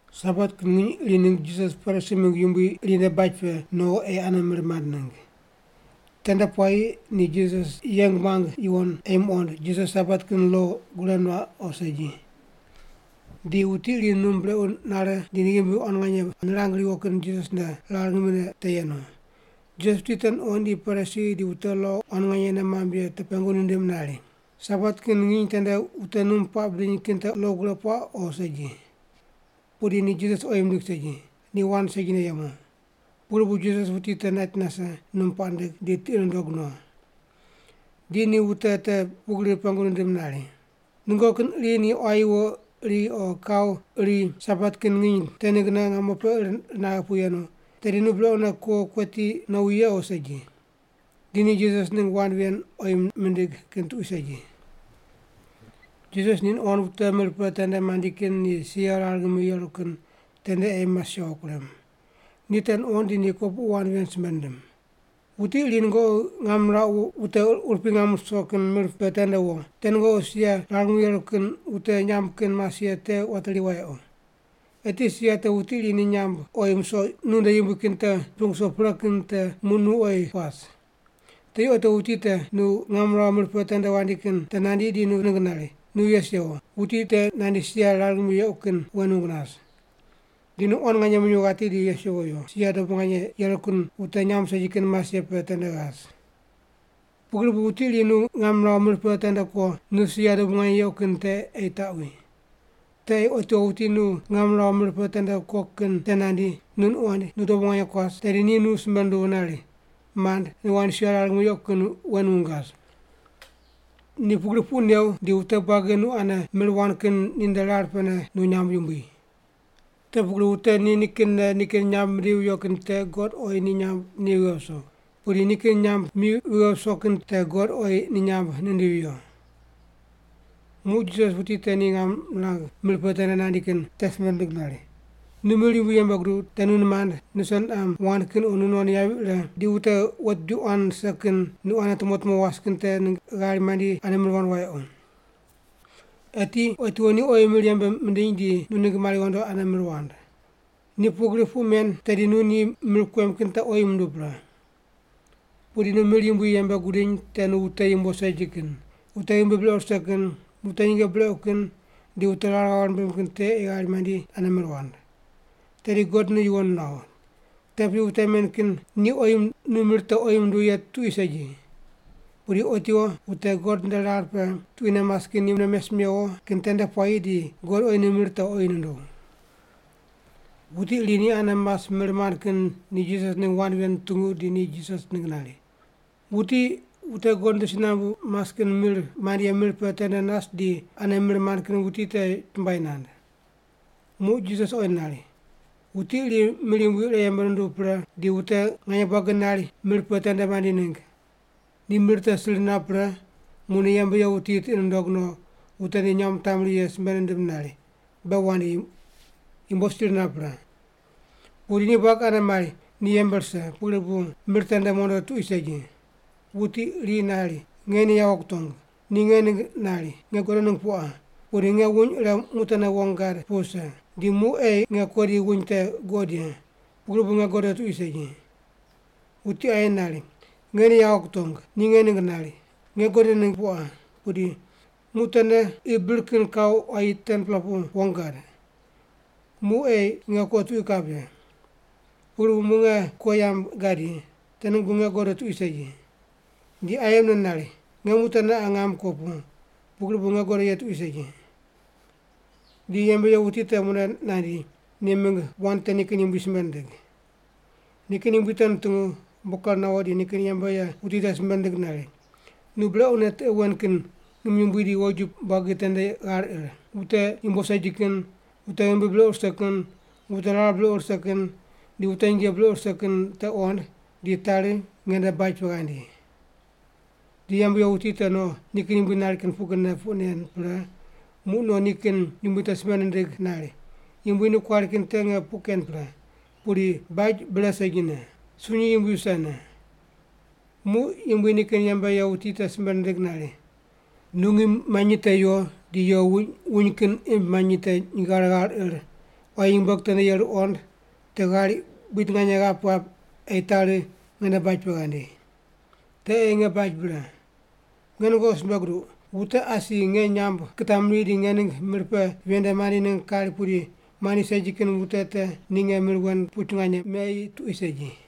Sabat kin nginy iri ningg Jisas Parisi mingg yumbui iri nde baj pe no ei ane mir mand ningg. Tende puayi ni Jisas yeng muang yuwon ei muqond, Jisas Sabat kin lo gure nuaq o segi. Di wuti iri num brequ nare di ni ghimbi quan nganye nirang riwo kin Jisas nde rar ngimine te yenu. Jisas wuti te nuqoind di Parisi di wute lo quan nganye nei mamb ye te pengu nindim nari, “Sabat kin nginy tende wute num puaq bidiny kin te lo gure puaq o segi?” Pudi ni Jisas oyi mindig segi, ni wand segine yemu. Pugri bu Jisas wuti te nait nase, num puaq nindig, di tiqi nundog no. Di ni wute te pugri pengu nindim nari, “Nungoqi kin iri ni quayi wo iri o kau iri Sabat kin nginy te ninggne ngamo pe ir naghe pu yenu, tedi nu brequne kuo kueti nowi ye o segi?” Di ni Jisas ningg wand ven oyi mindig kin tuqui segi. Jisas ni nuqond wute mir pe tende mandi kin ni sia rar ngimi yeru kin tende ei mas yawo kurem. Ni te nuqond di kopuqu wand ven simbe nindim. “Wuti iri nungoqi ngam nirauq wute urupui ngam ruso kin mir pe tende wo, te nungoqi sia rar ngimi yeru kin wute nyamb kin mas ye te wateri wayequ. Eti sia te wuti iri ni nyamb oyi musoq nu nde yumbui kin te miping wuso pre kin te muq nu oyi kuas. Tedi otiwo wuti nu tequ ngam nirauq mir pe tende wandi kin te nandi di nu ningg nari, ‘Nu yes yewo, wuti te nandi sia rar ngimi yequ kin wen wung nas.’ Di nu quan nganye minyuw ghati di yes yewo yo, sia dobu nganye yeru kin wute nyamb segi kin mas ye pe tende ghas. Pugri bu wuti iri nu ngam niraw mir pe tende kuo, nu sia dobu nganye yequ kin te ei taqwi. Te ei otiwo wuti nu ngam niraw mir pe tende kuo kin te nandi, nu nuqoind, nu dobu nganye kuas, tedi ni nu simbe nunduw nari, ‘Mand, nu ghandi sia rar ngimi yequ kin wen wung ghas.’ Ni pugri puq new, di wute buagi nu ane mir wand kin ninde rar pene nu nyamb yumbui. Te pugri wute ni kinne nikin nyamb mindivi viyo kin te God oyi ni nyamb ni vighe viso. Pudi nikin nyamb mi vighe viso kin te God oyi ni nyamb nindivi viyo.” Muq Jisas wuti te ni ngam nirang mir pe tende nandi kin te simbe nindig nari, “Nu mir yumbui yembe guduw, te nu nimand, nuse niqam wand kin o nu non yavi ire, di wute wet bidi quan rise kin nu ane tumo tumo was kin te ningg ghari mandi ane mir wand wayequ. Eti otiwo ni oyi mir yembe mindiny di nu ningg mari ghondo ane mir wand. Ni pugri puq men tedi nu ni mir kuem kin te oyi munduw pre. Pudi nu mir yumbui yembe gudiny te nu wute yumbo segi kin, wute ghimbi brequ rise kin, wute nyinge brequ kin, di wute rar ghave rimbim kin te ei ghari mandi ane mir wand. Tedi God nu yuwon nuaw. Te piyi wute men kin ni oyi nu mir te oyi munduw ye tuqui segi. Pudi otiwo wute God nde rar pe tuquine mas kin ni mune mes mewo kin tende puayi di God oyi nu mir te oyi nunduw.” Wuti iri ni ane mas mir mand kin ni Jisas ningg wand ven nutungu di ni Jisas ningg nari, “Wuti wute God nde si nambu mas kin mir mand ye mir pe tende nas di ane mir mand kin wuti te chumbuai nand.” Muq Jisas oyi nari, “Wuti iri mir yumbui ire yembe nunduw pre, di wute nganye buagi nari mir pe tende mandi ningg. Ni mir te sir nap pre, muq ni yembe ye wuti tiqi nundog no, wute ni nyamb nitamri ye simbe nindim nari, ‘Be wandi, yumbo buagi sir nap pre.’ “Pudi ni buagi anene mari ni yembe rise, pugri bu mir tende mondo tuqui segi. Wuti iri nari, ‘Nge ni yawo kutong, ni nge ningg nari. Nge godo ningg pu qa, pudi nge wuny ire muq teneqa wong gad pu vise. Di muq ei nge ko di wuny te guqod ye, pugri bu nge godo tuqui segi.’ “Wuti aye nari, ‘Nge ni yawo kutong, ni nge ningg nari. Nge godo ningg pu qa, pudi muq tene qi bir kin kau quayi 10-pela pu wong gad. Muq ei nge ko tuqui kap ye. Pugri bu muq nge ko yamb gadi. Te ningg bu nge godo tuqui segi.’ “Di aye mune nari, ‘Nge muq tene qa ngam ko pu, pugri bu nge godo ye tuqui segi.’ “Di yembe ye wuti te mune nandi, ni mingg wand te nikin yumbui simbe nindig. Nikin yumbui te nutungu, umbo ker nawo di nikin yembe ye wuti te simbe nindig nari, ‘Nu brequne tiqe wen kin ngim yumbui di woju buagi tende ghar ir, wute yumbo segi kin, wute ghimbi brequ rise kin, wute rar brequ rise kin, di wute nyinge brequ rise kin te qond, di tari nge nde baj pe ghandi.’ “Di yembe ye wuti te no nikin yumbui nari kin pugrine puq nen pre, muq no nikin yumbui te simbe nindig nari, ‘Yumbui, nu kuari kin te nge puq ken pre, pudi baj bre segine. Sunyi yumbui visene.’ “Muq yumbui nikin yembe ye wuti te simbe nindig nari, ‘Nu ngim manyi te yo di yo wuny kin imb manyi te nyinge ghare ghar ir, quayi nyumbueg tende yeru qond, te ghari buid nganye ghap ghap ei tari nge nde baj pe ghandi. Te ei nge baj bre. Nge nungoqi simbe guduq, wute asi nge nyamb kitamri di nge ningg mir pe ven nde mandi ningg kari pudi mandi segi kin wute te ni nge mir wen kin puch nganye me tuqui segi.’”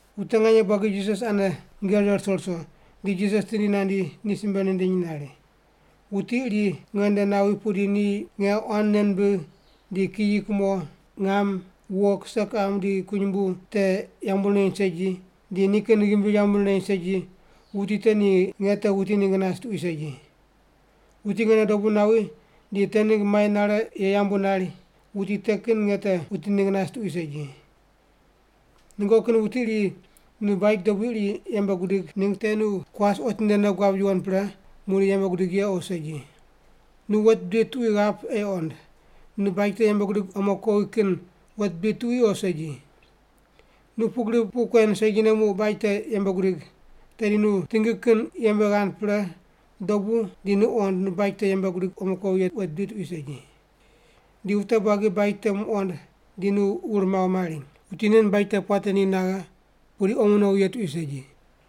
Wute nganye buagi Jisas ane nyinge rire ruso ruso, di Jisas tindi nandi ni simbe nindiny nari, “Wuti iri nge nde nawi pudi ni nge quan nei nimbigh di kiyi, kumo, ngam, wo, kise, kiqam, di kunyumbu te yambu nireny segi, di nikin ghimbi yambu nireny segi, wuti te ni nge te wuti ningg nas tuqui segi. Wuti nge nde dobu nawi di te ningg mai nare ye yambu nari, wuti te kin nge te wuti ningg nas tuqui segi. “Nungoqi kin wuti iri nu baj dobui iri yembe gudig ningg te nu kuas otinde nei guab yuwon pre, muqdi yembe gudig ye o segi? Nu wet bidi tuqui ghap ei qond, nu baj te yembe gudig omo kuowi kin wet bidi tuqui o segi. Nu pugri puq kuen segine muq baj te yembe gudig, tedi nu tingi kin yembe ghand pre dobu di nu qond nu baj te yembe gudig omo kuowi ye wet bidi tuqui segi. Di wute buagi baj te muqoind, di nu wur maw mari, ‘Wuti nen baj te puate ni naghe, pudi omo nowi ye tuqui segi’.”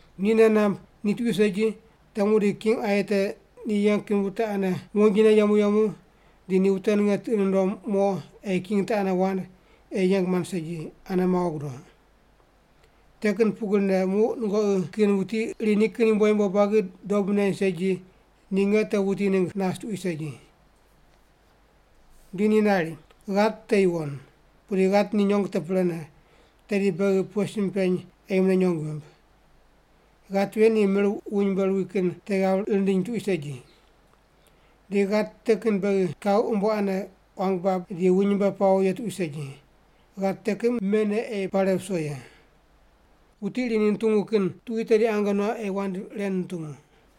Ni nei namb ni tuqui segi, te muqdi king aye te ni yeng kin wute ane wonjine yemu yemu di ni wute ninge tiqi nundom mo ei king te ane wand ei yeng mand segi, ane mawo gudo. Te kin pugrine muq nungoqi kin wuti iri nikin yumbo yumbo buagi dob neny segi, ni nge te wuti ningg nas tuqui segi.” Di ni nari, “Ghat te yuwon. Pudi ghat ni nyong te prene, tedi beghi pughe sim peny ei mune nyong vimb? Ghat ven ni mir wuny mbe ruwi kin te ghav rindiny tuqui segi. Di ghat te kin beghi kau umbo ane quang bab di wuny mbe pawo ye tuqui segi. Ghat te kin mene ei pare viso ye. “Wuti iri ni nutungu kin tuqui tedi ange nuaq ei wand ren nutungu.”